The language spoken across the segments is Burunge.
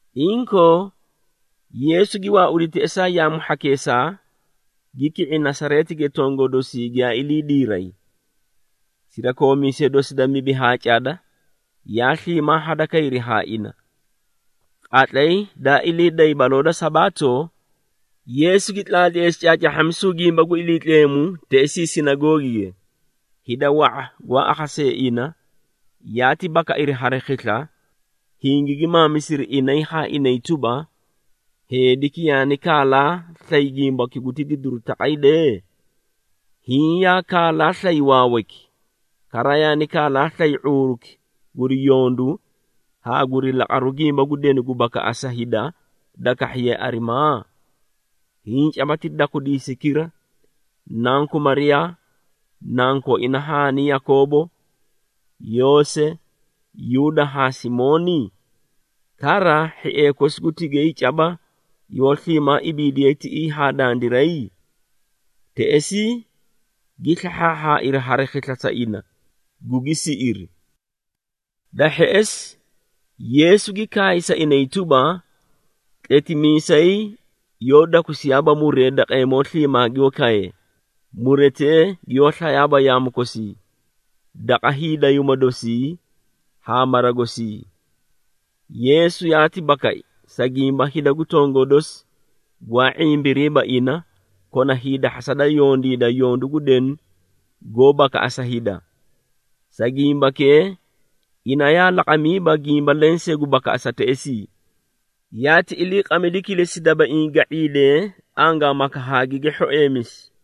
Inkoo Yeesu gi waaudi teꞌesaa yaamu hhakeesaa, gi ki⁄i Nasareetige tongoo dosii giyaa ilii diiray. Sirakoomiisee dosi da mibi haa cada yaa sliimaa hadakayri haa ina. Qatlay daa ilii day baloo da Sabaato, Yeesu gi tlaatleesi caacaahhamisu gimba gu Iliitleemu teꞌesii sinagoogige. Hida wa⁄a gwaa akhasee ina yaati bakairi hari khisla, hingigi maamisiri inay haa inay tuba, “Heediki yaani kaalaa slay gimbaki guti didiru taqay dee? Hiĩ yaa kaalaa slay waawayki, kara yaani kaalaa slay ⁄uuruki guri yondu haa guri laqaru gimba gu denu gu bakaꞌasa hida da kahhiye arimaa? Hiĩ caba ti dakwidiisaykira, nanku Mariyaa, nankooina haani Yakoobo, Yoose, Yuuda haa Simooni? Kara hhiee kosi gu tigay caba yoó sliimaa ibiidiyay tiꞌii haa dandiray?” Teꞌesii gi slahhaahhaairi hari khisla sa ina, gugi siꞌiri. Da hheꞌesi, Yeesu gi kaay sa inay tuba, “Tletimiisay yoó dakusiyaaba muree daqeemoo sliimaa gi kaye, muretee giyoó slayaaba yaamu kosii, daqa hiidayuuma dosii haa mara gosii.” Yeesu yaati bakai, sa gimba hida gu tongoo dosi gwaa ⁄imbiriiba ina kona hiidahhasa da yondiida yondu gu denu goó bakaꞌasa hida. Sa gimbakee ina yaa laqamiiba gimba lensee gu bakaꞌasa teꞌesii, yaati iliiqamidi kilesi dabaiĩ ga⁄iidee angaamaka haa gigi hhoeemisi.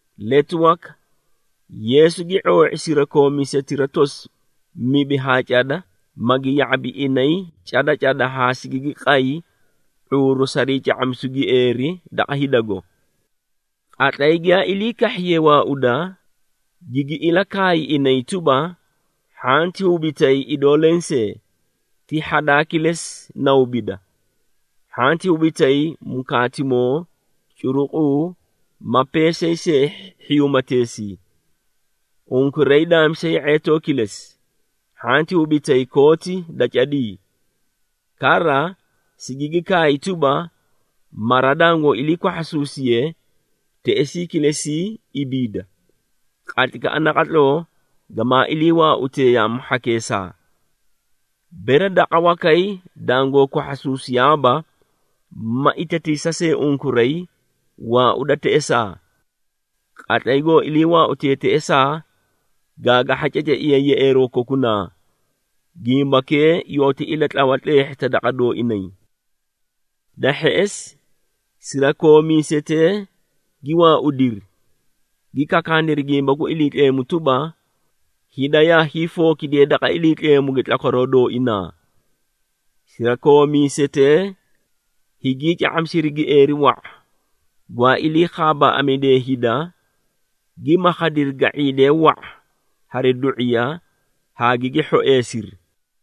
Letu waka, Yeesu gi ⁄oo⁄i sirakoomiisetira tosi mibi haa cada, magi ya⁄abi inay cada cada haa sigigi qay ⁄uuru sarii ca⁄amisu gieeri daqa hidago. Qatlay giyaa ilii kahhiyee waauda, gigi ilakaay inay tuba, “Hhanti hubitay idoo lensee, ti hhadaa kilesi na hubida. Hhanti hubitay mukaatimoo, curuquu, ma peesay see hhiyuumateesii. Unkuray daamisi ye⁄eetoo kilesi, hhanti hubitay kooti da cadii. Kara sigigi kaay tuba, mara dangoo ilii kwahhasuusiye, teꞌesii kilesii ibiida, qatlaykaꞌa naqatloo gamaa ilii waautee yaamu hhakeesaa. Bere daqa wakay dangoo kwahhasuusiyaaba, ma itatiisa see unkuray, waauda teꞌesaa. Qatlay goo ilii waautee teꞌesaa, gaagahha ceceiya yeꞌeeroo kokunaa, gimbakee yooti ilatlawa tleehhita daqa dooinay.” Da hheꞌesi, sirakoomiisetee gi waaudiri, gi kakaaniri gimba gu Iliitleemu tuba, hida yaa hiifookidiyee daqa Iliitleemuge tlakwaroo dooina. Sirakoomiisetee higii ca⁄amisiri gieeri wa⁄a, gwaa ilii khaabaaꞌamidee hida, gi makhadiri ga⁄iidee wa⁄a hari du⁄iya haa gigi hhoeesiri.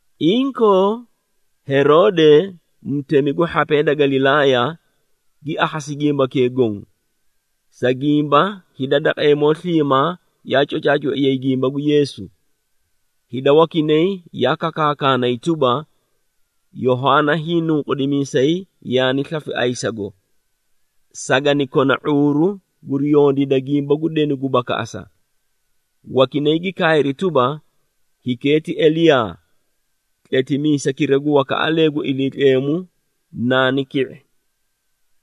Inkoo Heroode, mutemi gu hhapee da Galilaaya, gi akhasi gimbakee goõ, sa gimba hida daqeemoo sliimaa yaa cocaacoiyay gimba gu Yeesu. Hida wakinay yaa kakaakaanay tuba, “Yohaana Hiinunqudimiisay yaani slafi ayisago! Sagani kona ⁄uuru guri yondiida gimba gu denu gu bakaꞌasa.” Wakinay gi kaayri tuba, “Hikee ti Eliyaa, tletimiisaykira gu wakaꞌalee gu Iliitleemu naani ki⁄i!”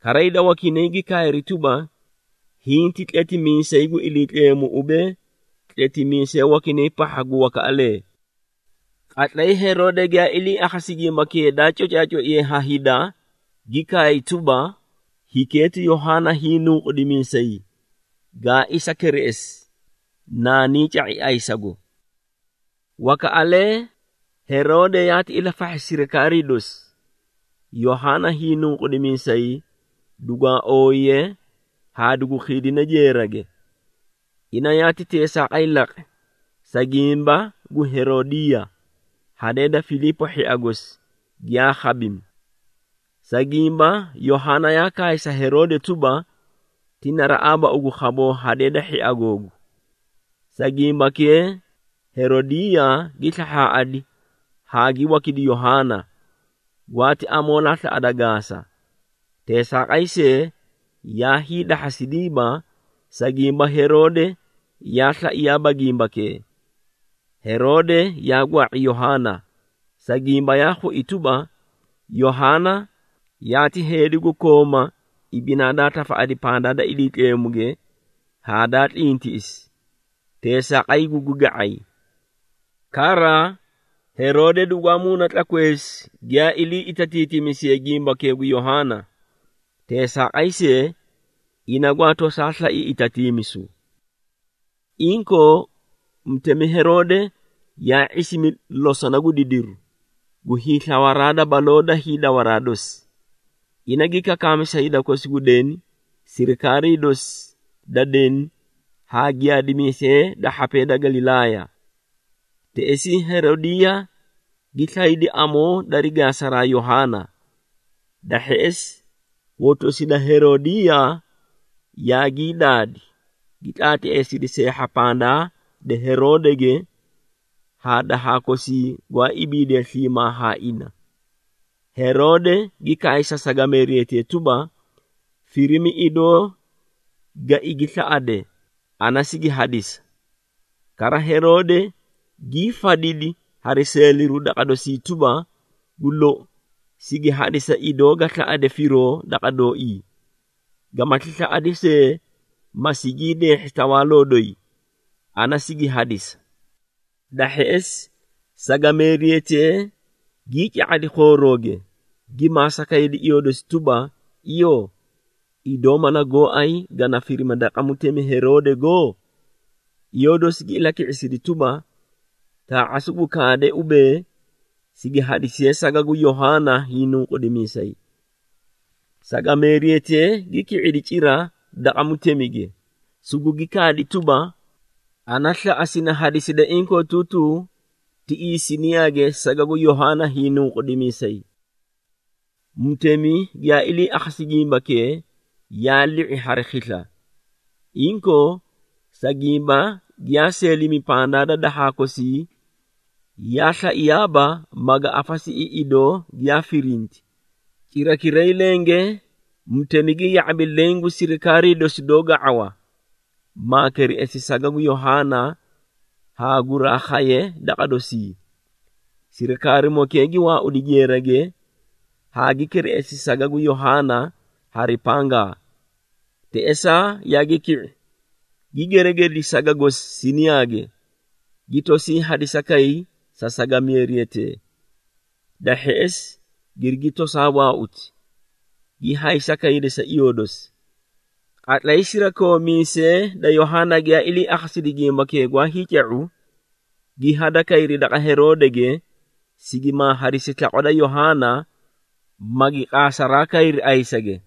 Kara hida wakinay gi kaayri tuba, “Hiĩ ti tletimiisay gu Iliitleemu ubee, tletimiisee wakinay pahha gu wakaꞌalee.” Qatlay Heroode giyaa ilii akhasi gimbakee daa cocaacoiye ha hida, gi kaay tuba, “Hikee ti Yohaana Hiinunqudimiisay, gaa isa kereꞌesi, naanii ca⁄i ayisago!” Wakaꞌalee, Heroode yaati ilafahhi sirikaarii dosi, Yohaana hiinuqudimiisay dugwaa ooyiye haa dugu khiidine jeerage. Ina yaati teesaaqay laqi, sa gimba gu Heroodiiya, hadee da Filiipo hhia gosi, giyaa khabimi. Sa gimba, Yohaana yaa kaay sa Heroode tuba, “Ti naraꞌaaba ugu khaboo hadee da hhia googu.” Sa gimbakee Heroodiiya gi slahhaꞌadi haa gi wakidi Yohaana, gwaati amoolaa slaꞌada gaasa. Teesaaqay see, yaa hiidahhasidiiba, sa gimba Heroode yaa slaiyaaba gimbakee. Heroode yaa gwaa⁄i Yohaana, sa gimba yaa khui tuba, Yohaana yaati heedi gu kooma ibinaa daa tafaꞌadi pandaa da Iliitleemuge haa daa tlintiꞌisi, teesaaqay gugi ga⁄ay. Kara, Heroode dugwaa muuna tlakweesi giyaa ilii itatiitimisiye gimbakee gu Yohaana. Teesaaqay see, ina gwaa tosaa slai itatiimisu. Inkoo, Mutemi Heroode yaa ⁄isimi losona gu didiru, gu hiislawaraa baloo da hiidawaraa dosi. Ina gi kakaami sa hida kosi gu deni, sirikaarii dosi da deni haa giyaadimiisee da hhapee da Galilaaya. Teꞌesii Heroodiiya gi slaydi amoo dari gaasa Yohaana. Da hheꞌesi, hotosi da Heroodiiya yaagii daadi, gi tlaatleesidi seehha pandaa da Heroodege haa dahaa kosii gwaa ibiidee sliimaa haa ina. Heroode gi kaay sa sagameeriyatee tuba, “Firimi idoo ga igi slaꞌade, ana sigi hadisa.” Kara Heroode gii fadidi hari seeliru daqa dosii tuba, “Gu lou, sigi hadisa idoo ga slaꞌade firoo daqa dooii, gamati slaꞌadi see, ma sigii deehhi tawaaloo doyi, ana sigi hadisa.” Da hheꞌesi, sagameeriyatee gii ca⁄adi khoorooge, gi maasa kaydi iyoo dosi tuba, “Iyoo, idoo mala gooay gana firima daqa mutemi Heroodego?” Iyoo dosi gi ilaki⁄isidi tuba, “Taa⁄a sugu kaade, ubee, sigi hadisiye saga gu Yohaana Hiinunqudimiisay.” Sagameeriyatee gi ki⁄idi cira daqa mutemige, sugugi kaadi tuba, “Ana slaꞌa sini hadiside inkootuutuu tiꞌii siniyaage saga gu Yohaana Hiinunqudimiisay.” Mutemi giyaa ilii akhasi gimbakee, yaa li⁄i hari khisla. Inkoo, sa gimba giyaa seelimi pandaa da dahaa kosii, yaa slaiyaaba maga afasiꞌi idoo giyaa firinti. Cirakiray lenge mutemi gi ya⁄abi leẽ gu sirikaarii dosi doó ga⁄awa, maa kereꞌesi saga gu Yohaana haa guraa khaye daqa dosii. Sirikaarimokee gi waaudi jeerage haa gi kereꞌesi saga gu Yohaana hari pangaa. Teꞌesaa yaagi ki⁄i, gi geregedi saga gosi siniyaage, gi tosii hadisi sa sagameeriyatee. Da hheꞌesi girigi tosaa waauti, gi haysa kaydi sa iyoo dosi. Qatlay sirakoomiisee da Yohaana giyaa ilii akhasidi gimbakee gwaa hiica⁄u, gi hadakayri daqa Heroodege, sigimaa hadisi slaqwa da Yohaana, magi qaasaraa kayri aysage.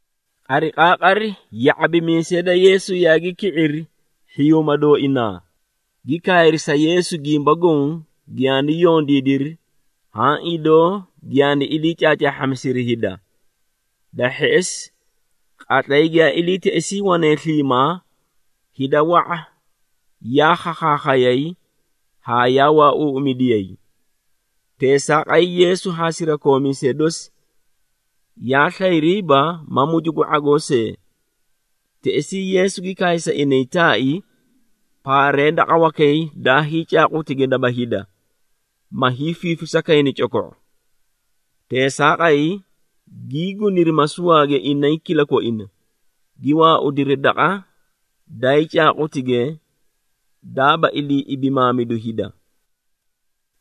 Qariqaaqari ya⁄abimiisee da Yeesu yaagi ki⁄iri hhiyuuma dooinaa, gi kaayri sa Yeesu gimba goõ giyaani yondiidiri haã idoo giyaani ilii caacaahhamisiri hida. Da hheꞌesi, qatlay giyaa ilii teꞌesii wane sliimaa, hida wa⁄a yaa khakhaakhayay haa yaa waauuꞌumidiya. Teesaaqay Yeesu haa sirakoomiisee dosi yaa slayriiba ma mucu gu ⁄agoo see. Teꞌesii Yeesu gi kaay sa inay taai, “Paaree daqa wakay dayii caaqutige daba hida, ma hiifiifisa kayni coko⁄o.” Teesaaqay, gii guniri masuwaage inay kilakoina, gi waaudiri daqa dayii caaqutige, daaba ilii ibimaamidu hida.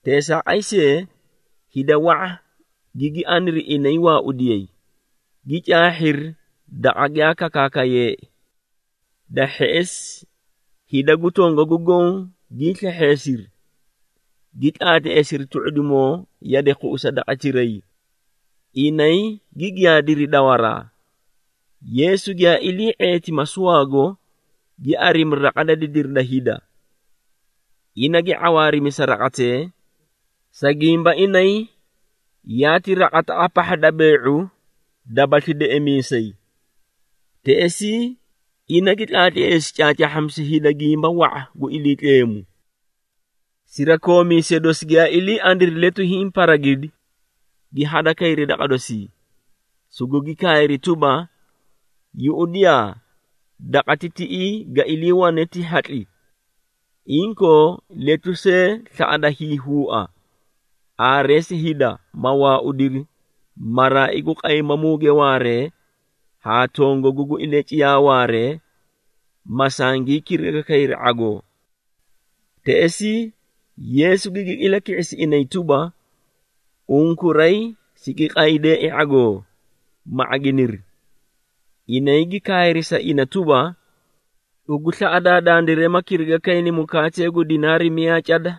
Teesaaqay see, hida wa⁄a gigi ariniri inay waaudiyay, gi caahhiri daqa giyaa kakaakayeei. Da hheꞌesi hida gu tongagu goõ gii slehheesiri, gi tlaatleesiri tu⁄udimoo yade khuꞌusa daqatiray, inay gi giyaadiri dawaraa. Yeesu giyaa ilii ⁄eeti masuwaago, gi arimi raqa da didiri da hida. Ina gi ⁄awaarimi sa raqatee, sa gimba inay yaati raqataꞌa pahha da bee⁄u dabasli deꞌemiisay. Teꞌesii, ina gi tlaatleesi caacaahhamisu hida gimba wa⁄a gu Iliitleemu. Sirakoomiisee dosi giyaa ilii aniri letu hiĩ paragidi, gi hadakayri daqa dosii, sugugi kaayri tuba, “Yuꞌudiyaa, daqati tiꞌii ga iliiwane ti hatli, inkoo letu see slaꞌada hiihuua. Aareesi hida, ma waaudiri maraai gu qaymamuge waaree haa tongagu gu ilaciyaa waaree, ma sangii kiriga kayri ⁄agoo.” Teꞌesii, Yeesu gigi ilaki⁄isi inay tuba, “Unkuray sigi qaydeei ⁄agoo, ma ⁄aginiri!” Inay gi kaayri sa ina tuba, “Ugu slaꞌadaa dandiray ma kiriga kayni mukaatee gu dinaari miyaa cada,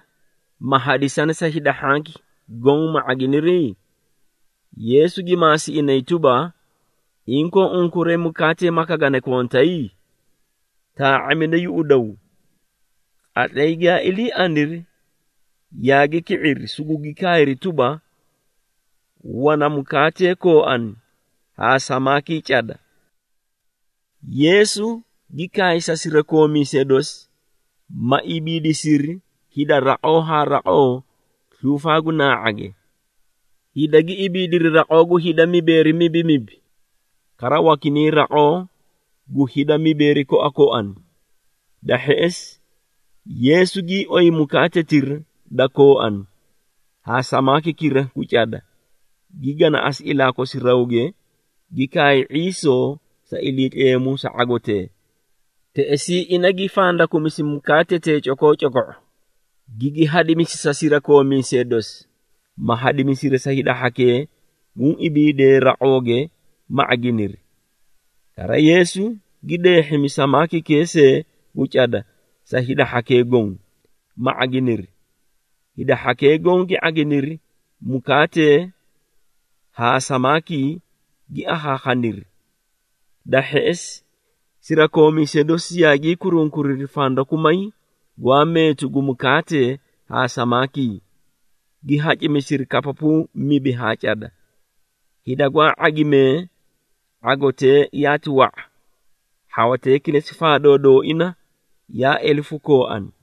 ma hadisani sa hida hhanki goõ ma ⁄aginiri?” Yeesu gi maasi inay tuba, “Inkoo unkuray mukaatee maka gana kontay? Taa⁄amida yuꞌudaw.” Qatlay giyaa ilii aniri, yaagi ki⁄iri, sugugi kaayri tuba, “Wana mukaatee kooani haa samaakii cada.” Yeesu gi kaay sa sirakoomiisee dosi, ma ibiidisiri hida raqoo haa raqoo sluufaa gu naa⁄age. Hida gi ibiidiri raqoo gu hida mibeeri mibimibi, kara wakinay raqoo gu hida mibeeri koakoani. Da hheꞌesi, Yeesu gii oyi mukaatetira da kooani haa samaakikira gu cada, gi ganaꞌasi ilaa kosi rawge, gi kaay ⁄iisoo sa Iliitleemu sa ⁄agotee. Teꞌesii ina gi fandakumisi mukaatetee cokoocoko⁄o, gigi hadimisi sa sirakoomiisee dosi, ma hadimisiri sa hida hhakee guũ ibiidee raqooge, ma ⁄aginiri. Kara Yeesu gi deehhimi samaakikee see gu cada sa hida hhakee goõ, ma ⁄aginiri. Hida hhakee goõ gi ⁄aginiri mukaatee haa samaakii, gi akhaakhaniri. Da hheꞌesi, sirakoomiisee dosi yaagii kurunkuriri fandakumay gwaa meetu gu mukaatee haa samaakii, gi hacimisiri kapapuu mibi haa cada. Hida gwaa ⁄agimee ⁄agotee yaati wa⁄a, hhawatee kilesi faadoo dooina yaa elefu kooani.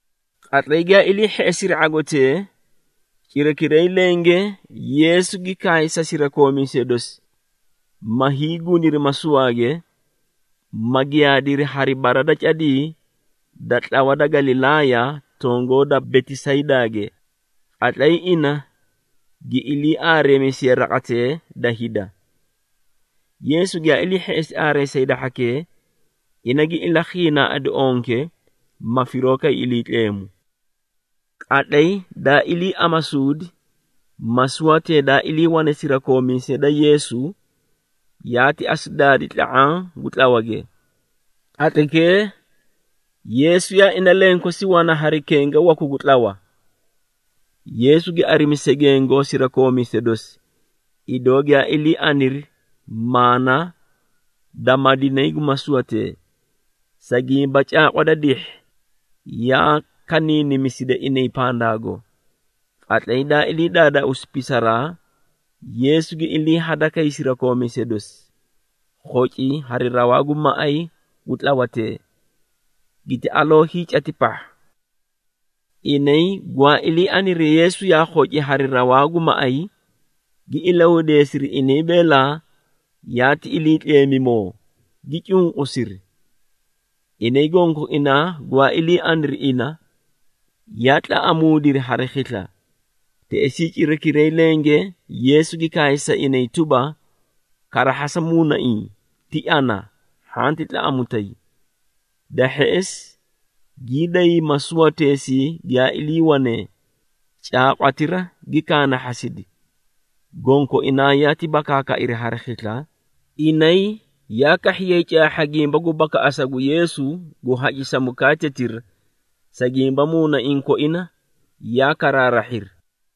Qatlay giyaa ilii hheꞌesiri ⁄agotee, cirakiray lenge Yeesu gi kaay sa sirakoomiisee dosi, ma hiiguniri masuwaage, ma giyaadiri hari bara da cadii da tlawa da Galilaaya tongoo da Betisaydaage. Qatlay ina gi ilii aareemisiye raqatee da hida. Yeesu giyaa ilii hheꞌesi aareesa hida hhakee, ina gi ilakhiinaaꞌadi onke, ma firoo kay Iliitleemu. Qatlay daa ilii amasuudi, masuwatee daa iliiwane sirakoomiisee da Yeesu, yaati asu daadi tla⁄aã gu tlawage. Qatlaykee, Yeesu yaa ina lenkosi wana hari kenga waku gu tlawa. Yeesu gi arimi segengo sirakoomiisee dosi, idoo giyaa ilii aniri maana da madinay gu masuwatee, sa gimba caaqwa da dihhi yaa kaniinimisida inay pandaago. Qatlay daa ilii daadaauusi pisaraa, Yeesu gi ilii hadakay sirakoomiisee dosi, khoci hari rawaa gu maꞌay gu tlawatee, giti aloo hiicati pahha. Inay gwaa ilii aniri Yeesu yaa khoci hari rawaa gu maꞌay, gi ilahudeesiri inay beela, yaati iliitleemumoo, gi cunqusiri. Inay gonkoinaa gwaa ilii aniri ina, yaa tlaꞌamuudiri hari khisla. Teꞌesii cirakiray lenge Yeesu gi kaay sa inay tuba, “Karahhasa muunaiĩ, ti ana, hhanti tlaꞌamutay!” Da hheꞌesi, gii day masuwateesii giyaa iliiwanee, caaqwatira gi kaanahhasidi. Gonkoinaa yaati bakaakairi hari khisla, inay yaa kahhiyay caahha gimba gu bakaꞌasa gu Yeesu gu hacisa mukaatetira, sa gimba muunaiĩ koina yaa karaarahhiri.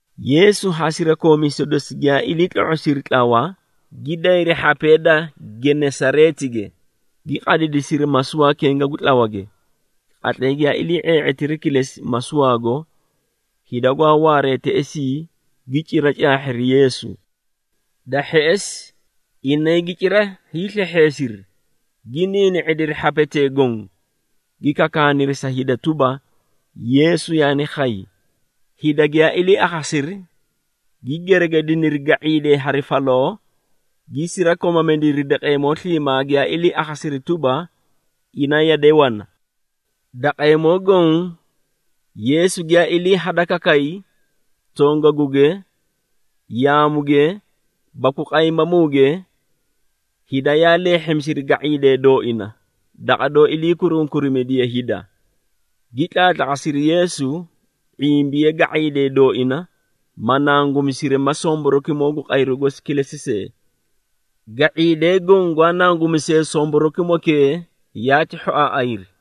Yeesu haa sirakoomiisee dosi giyaa ilii tlo⁄osiri tlawa, gi dayri hhapee da Genesareetige, gi qadidisiri masuwaa kenga gu tlawage. Qatlay giyaa ilii ⁄ee⁄eetiri kilesi masuwaago, hida gwaa waaree teꞌesii gi cira caahhiri Yeesu. Da hheꞌesi, inay gi cira hiislehheesiri, gi niini⁄idiri hhapetee goõ, gi kakaaniri sa hida tuba, Yeesu yaani khay. Hida giyaa ilii akhasiri, gi geregediniri ga⁄iidee hari faloo, gi sirakomamidiri daqeemoo sliimaa giyaa ilii akhasiri tuba, ina yade wana. Daqeemoo goõ Yeesu giyaa ilii hadakakay, tongaguge, yaamuge baku qaymamuge, hida yaa leehhimisiri ga⁄iidee dooina daqa doó ilii kurunkurimidiye hida, gi tlaatlaqasiri Yeesu, ⁄imbiye ga⁄iidee dooina, ma nangumisiri ma somborokimoo gu qayru gosi kilesi see. Ga⁄iidee goõ gwaa nangumisee somborokimokee yaati hhoaaꞌayri.